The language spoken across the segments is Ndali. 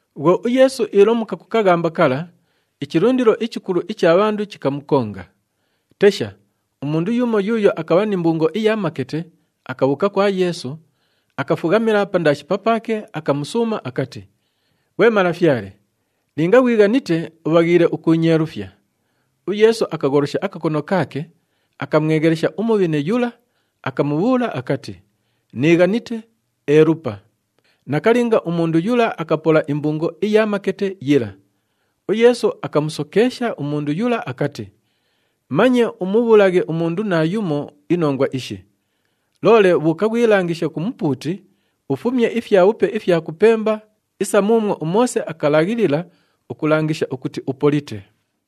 Bhwo uYeesu iilomuka ku kaghamba kala, ichilundilo ichikulu icha bhandu chikamukonga. Tesha, umundu yumo yuuyo akabha ni mbungo iya makete akabhuuka kwa Yeesu, akafughamila pandaashi papaake, akamusuuma akati, “Ghwe Malafyale, linga ghwighanite ubhaghiile ukuunyeelufya.” UYeesu akagholosha akakono kaake, akamweghelesha umubhine yula, akamubhuula akati, “Niighanite, elupa!” Nakalinga, umundu yula akapola imbungo iya makete yila. UYeesu akamusokeesha umundu yula akati, “Manye umubhuulaghe umundu naayumo inongwa ishi! Loole bhuuka ghwilangishe ku mupuuti, ufumye ifyabhupe ifya kupemba isa muumwo uMoose akalaghilila ukulangisha ukuti upolite.”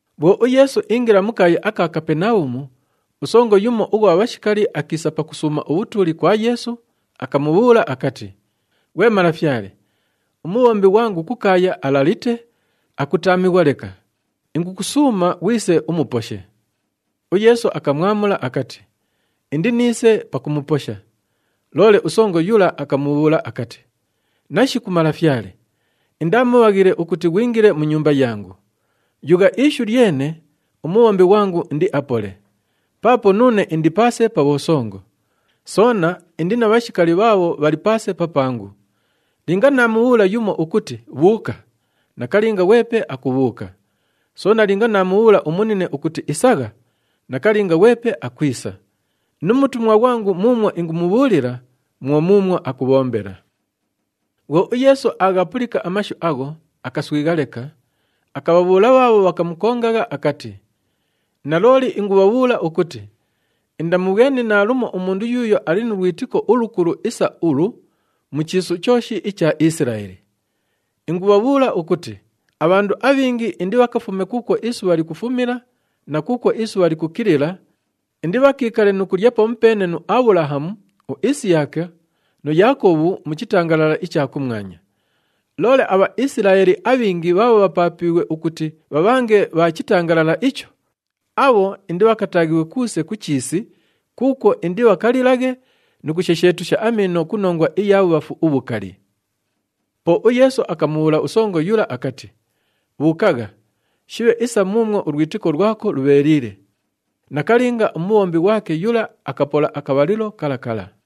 Bhwo uYeesu iingila mu kaaya aka Kapenabhumu, usongo yumo ughwa bhashikali akiisa pakusuuma ubhutuuli kwa Yeesu, akamubhuula akati, “Ghwe Malafyale, umubhombi ghwangu kukaaya alalite, akutaamighwa leka. Ingukusuuma ghwise umuposhe.” UYeesu akamwamula akati, “Indiniise pakumuposha.” Loole usongo yula akamubhuula akati, “Nashiku Malafyale! Indaa mubhaghile ukuti ghwingile mu nyumba yangu. Yugha ishu lyene, umubhombi ghwangu indiapole. Paapo nuune indi paase pa bhosongo. Soona indi na bhashikali bhaabho bhali paase papangu. Linga naamubhuula yumo ukuti, ‘Bhuuka!’ nakalinga ghwepe akubhuuka. Soona linga naamubhuula umunine ukuti, ‘Isagha!’ nakalinga ghwepe akwisa. Nu mutumwa ghwangu muumwo ingumubhuulila, mwo muumwo akubhombela.” Bhwo uYeesu aaghapulika amashu agho, akaswigha leka, akabhabhuula bhaabho bhakamukongagha akati, “Nalooli ingubhabhuula ukuti, indamubhweni naalumo umundu yuuyo ali nu lwitiko ulukulu isa ulu mu chiisu chooshi icha Isilaeli! Ingubhabhuula ukuti abhandu abhingi indibhakafume kuukwo isubha likufumila na kuukwo isubha likukilila, indibhakiikale nu kulya pamupeene nu Abhulahamu, uIsiyaka nu Yaakobhu mu chitangalala icha kumwanya. Loole aBhaisilaeli abhingi bhaabho bhapaapiighwe ukuti bhabhange bha chitangalala icho, abho indibhakataaghighwe kuuse ku chiisi kuukwo indibhakalilaghe nu kushesheetusha amiino ku nongwa iya bhubhafu ubhukali.” Po uYeesu akamubhuula usongo yula akati, “Bhuukagha! Shibhe isa muumwo ulwitiko lwako lubheeliile.” Nakalinga, umubhombi ghwake yula akapola akabhalilo kala kala.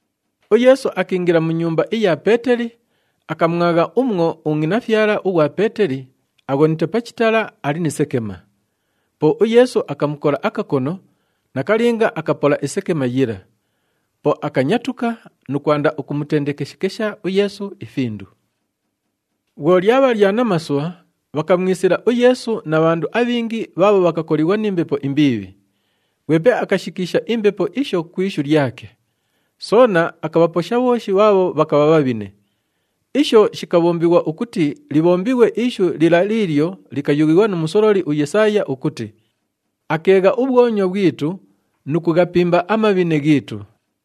UYeesu akiingila mu nyumba iya Peeteli, akamwagha umwo ungʼinafyala ughwa Peeteli aghonite pa chitala, ali ni sekema. Po uYeesu akamukola akakono, nakalinga akapola isekema yila. Po akanyatuka nu kwanda ukumutendekeshekesha uYeesu ifindu. Bhwo lyabha lya namasubha, bhakamwisila uYeesu na bhandu abhingi bhaabho bhakakolighwa ni mbepo imbiibhi. Ghwepe akashikiisha imbepo isho ku ishu lyake. Soona akabhaposha bhooshi bhaabho bhakabha bhabhine. Isho shikabhombighwa ukuti libhombighwe ishu lila liilyo likayughighwa nu musololi uYesaaya ukuti, “Akeegha ubhwonywa bhwitu nu kughapimba amabhine ghiitu.”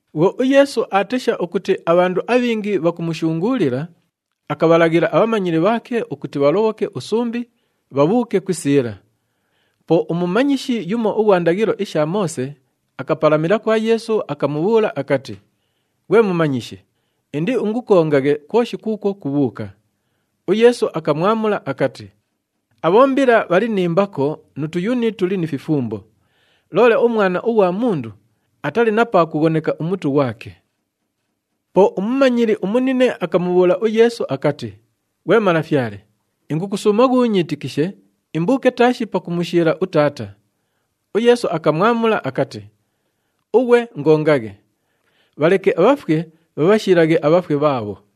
Bhwo uYeesu aatesha ukuti abhandu abhingi bhakumushunguulila, akabhalaghila abhamanyili bhaake ukuti bhalobhoke usumbi, bhabhuuke ku isiila. Po umumanyishi yumo ughwa ndaghilo isha Moose akapalamila kwa Yeesu, akamubhuula akati, “Ghwe Mumanyishi, indiingukongaghe kwoshi kuukwo kubhuuka.” UYeesu akamwamula akati, “Abhombila bhali ni mbako nu tuyuni tuli ni fifumbo, loole uMwana ughwa Mundu atali na pa kughoneka umutu ghwake!” Po umumanyili umunine akamubhuula uYeesu akati, “Ghwe Malafyale, ingukusuuma ghuunyiitikishe imbuuke taashi pakumushiila utaata.” UYeesu akamwamula akati, “Ughwe ingongaghe! Bhaleke abhafwe bhabhashiilaghe abhafwe bhaabho.”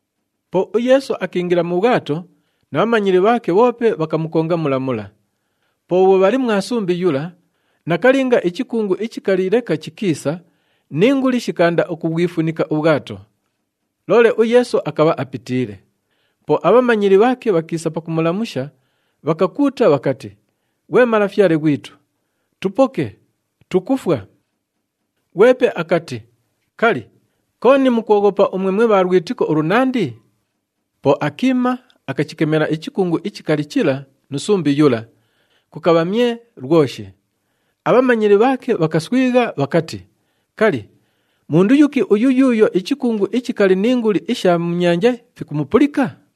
Po uYeesu akiingila mu bhwato na bhamanyili bhaake bhoope bhakamukonga mula mula. Po bhwo bhali mwa sumbi yula, nakalinga ichikungu ichikali leka chikiisa ni nguli shikaanda ukubhwifunika ubhwato. Loole uYeesu akabha apitiile. Po abhamanyili bhaake bhakiisa pakumulamusha, bhakakuuta bhakati, “Ghwe Malafyale ghwitu! Tupoke! Tukufwa!” Ghwepe akati, “Kali, kooni mukwoghopa umwe mwe bha lwitiko ulunandi?” Po akiima, akachikemela ichikungu ichikali chila nu sumbi yula, kukabha myee lwoshi. Abhamanyili bhaake bhakaswigha, bhakati, “Kali, mundu yuki uyu yuuyo ichikungu ichikali ni nguli isha mu nyanja fikumupulika?”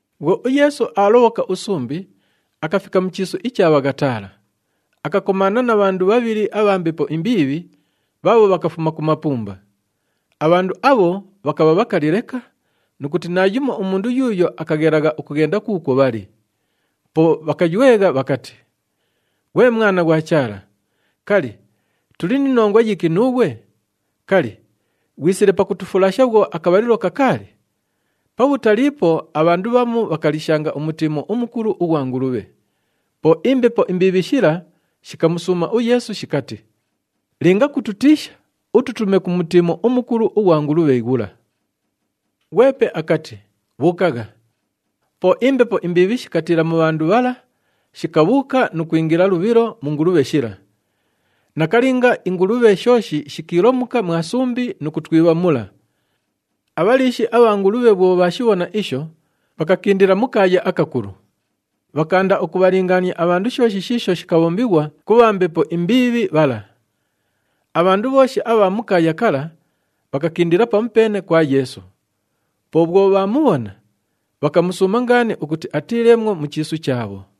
Bhwo uYeesu aalobhoka usumbi, akafika mu chiisu icha Bhaghataala. Akakomaana na bhandu bhabhili abha mbepo imbiibhi bhaabho bhakafuma ku mapumba. Abhandu abho bhakabha bhakali leka nu kuti naayumo umundu yuuyo akaghelagha ukughenda kuukwo bhali. Po bhakaywegha bhakati, “Ghwe Mwana ghwa Chaala, kali, tuli ni nongwa yiki nuughwe? Kali, ghwisile pakutufulasha bhwo akabhalilo kakaali?” Pabhutaliipo, abhandu bhamu bhakaliishanga umutiimo umukulu ughwa ngulubhe. Po imbepo imbiibhi shila shikamusuuma uYeesu shikati, “Linga kutukiisha, ututume ku mutiimo umukulu ughwa ngulubhe ghula.” Ghwepe akati, “Bhuukagha!” Po imbepo imbiibhi shikatiila mu bhandu bhala, shikabhuuka nu kwingila lubhilo mu ngulubhe shila. Nakalinga, ingulubhe shooshi shikiilomuka mwa sumbi nu kutwibha mula. Abhaliishi abha ngulubhe bhwo bhaashibhona isho, bhakakindila mu kaaya akakulu. Bhakaanda ukubhalingaania abhandu shooshi shiisho shikabhombighwa ku bha mbepo imbiibhi bhala. Abhandu bhooshi abha mu kaaya kala, bhakakindila pamupeene kwa Yeesu. Po bhwo bhaamubhona, bhakamusuuma ngaani ukuti atiileemwo mu chiisu chaabho.